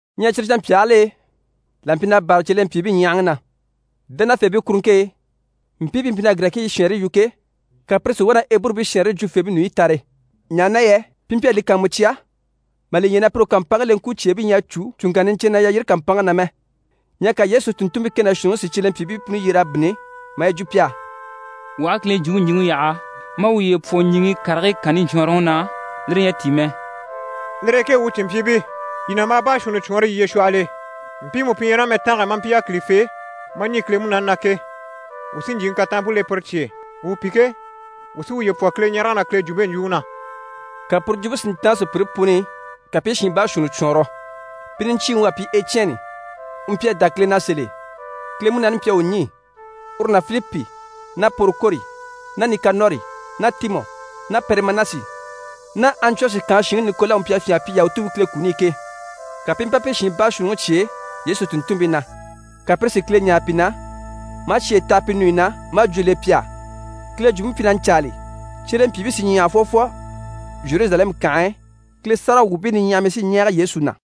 Ɲyɛ cyire canmpyaagil'e là mpyi na bârali cyelempyiibii ɲyahaŋi na. Dánafeebii kuruŋke e, mpii pi mpyi na Girɛkiibii shɛɛnre yu ke, ka pire si wá na Eburubii shɛɛnre jwufeebii ɲùɲyi tare, ɲaha na yɛ pi mpyi a li kàanmucya mà li ɲya na pire u kàmpanŋke leŋkwucyeebii ɲyɛ a cû cùŋkanna niɲcɛnnɛ na yalyire kàmpanŋke na mɛ. Ɲyɛ ka Yesu tùnntunmpii kɛ ná shuunniŋi si cyelempyiibii puni yyer'a bínni, maa yi jwo pi á: «Wuu aha Kile Jwumpe ɲjwuŋi yaha maa wuye pwɔ ɲjyìŋi karigii kanni ɲcwɔɔnrɔŋi na, lire ɲyɛ a tíi mɛ. Lire e ke wuu cìnmpyiibii, yii nàmbaa baashuunni cwɔɔnrɔ yiye shwɔhɔl'e, mpiimu pi ɲyɛ ná mɛtange e maa mpyi yákilifee, maa ɲî Kile Munaani na ke. Wuu sí ɲjyìŋi kataanmpe le pire cye e. Wuu pi ke, wuu sí wuye pwɔ Kileɲarege ná Kile jwumpe ɲjwuŋi na.» Ka puru jwumpe si ntáan sùpyire puni i, ka pi i shiin baashuunni cwɔɔnrɔ. Pi niɲcyiiŋi u à pyi Ecyɛni, u mpyi a dá Kile na sèl'e, Kile Munaani mpyi a u ɲî, uru ná Filipi ná Porokori ná Nikanɔri ná Timɔ ná Parimɛnasi ná Antiyɔshi kànhe shinŋi Nikola u mpyi a fyânha a pyi Yahutuubii Kile kuni i ke. Ka pi i mpa pire shiin baashuunniŋi cyêe Yesu tùnntunmpii na, ka pire si Kile ɲáare pi na, maa cyeyi taha pi ɲùɲyi na, maa jwó le pi á. Kile Jwumpe mpyi na ɲcaali, cyelempyiibii sí i ɲyahage fwɔfwɔ Zheruzalɛmu kànhe e, Kile sáragawwuubii niɲyahamii sí i ɲɛɛge Yesu na.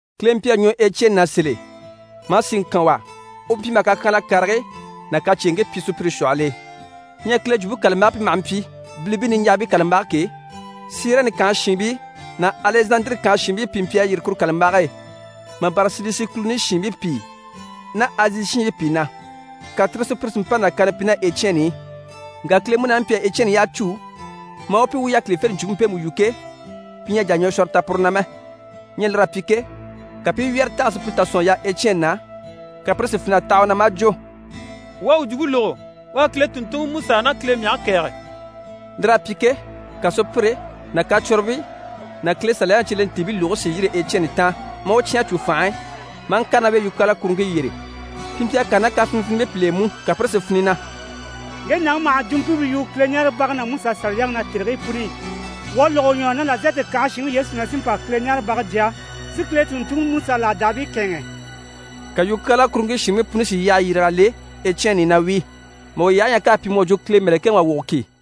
Kile mpyi a ɲwɔ Ecyɛni na sèl'e, maa síŋi kan u á. U mpyi maha kakyanhala karigii ná kacyeeŋkii pyi sùpyire shwɔhɔl'e. Ɲyɛ Kile Jwumpe kàlambage pi maha mpyi: «Bilibii niɲjahabii kàlambage» ke, Sirɛni kànhe shiinbii ná Alɛzandire kànhe shiinbii pìi mpyi a yîri kuru kàlambage e, mà bâra Silisi kùluni shiinbii pìi ná Azi shiinbii pìi na, ka tire sùpyire si mpa nàkaana pyi ná Ecyɛni i. Ŋka Kile Munaani mpyi a Ecyɛni yyaha cû maa u pyi u u yákilifente jwumpe mpemu yu ke, pi ɲyɛ a jà a ɲwɔshwɔrɔ ta puru na mɛ. Ɲyɛ lir'à pyi ke, ka pi i wyɛ́rɛŋi tɛ̀g'a sùpyire tà sɔ̀n a yaha Ecyɛni na, ka pire si fin'a taha u na maa jwo: «Wuu à u jwumpe lógo, u à Kile tùnntunŋiMusa ná Kile mɛge kɛ̀ɛge.» Lir'à pyi ke, ka sùpyire ná kacwɔnribii ná Kile Saliyaŋi cyelentiibii lùgigii si yîri Ecyɛni taan, maa u cyán a cû fànhe e, maa ŋkàre ná u e yukyaala kuruŋke yyére. Pi mpyi a kàre ná kafinivinibii pìl'e mú, ka pire si fini na: «Ŋge nàŋi maha jwumpimpe yu Kileɲaarebage ná Musa Saliyaŋi na tèrigii puni i. Wuu à lógo u ɲwɔ na na Nazarɛti kànhe shinŋi Yesu na sí n‑pa Kileɲaarebage jya, si Kile tùnntunŋi Musa làdaabii kɛ̂ɛnŋɛ.» Ka yukyaala kuruŋke shiinbii puni si yyahayi le Ecyɛni i na wíi, mà u yyahe ɲya k'à pyi mu à jwo Kile mɛ̀lɛkɛŋi wà wogo ki.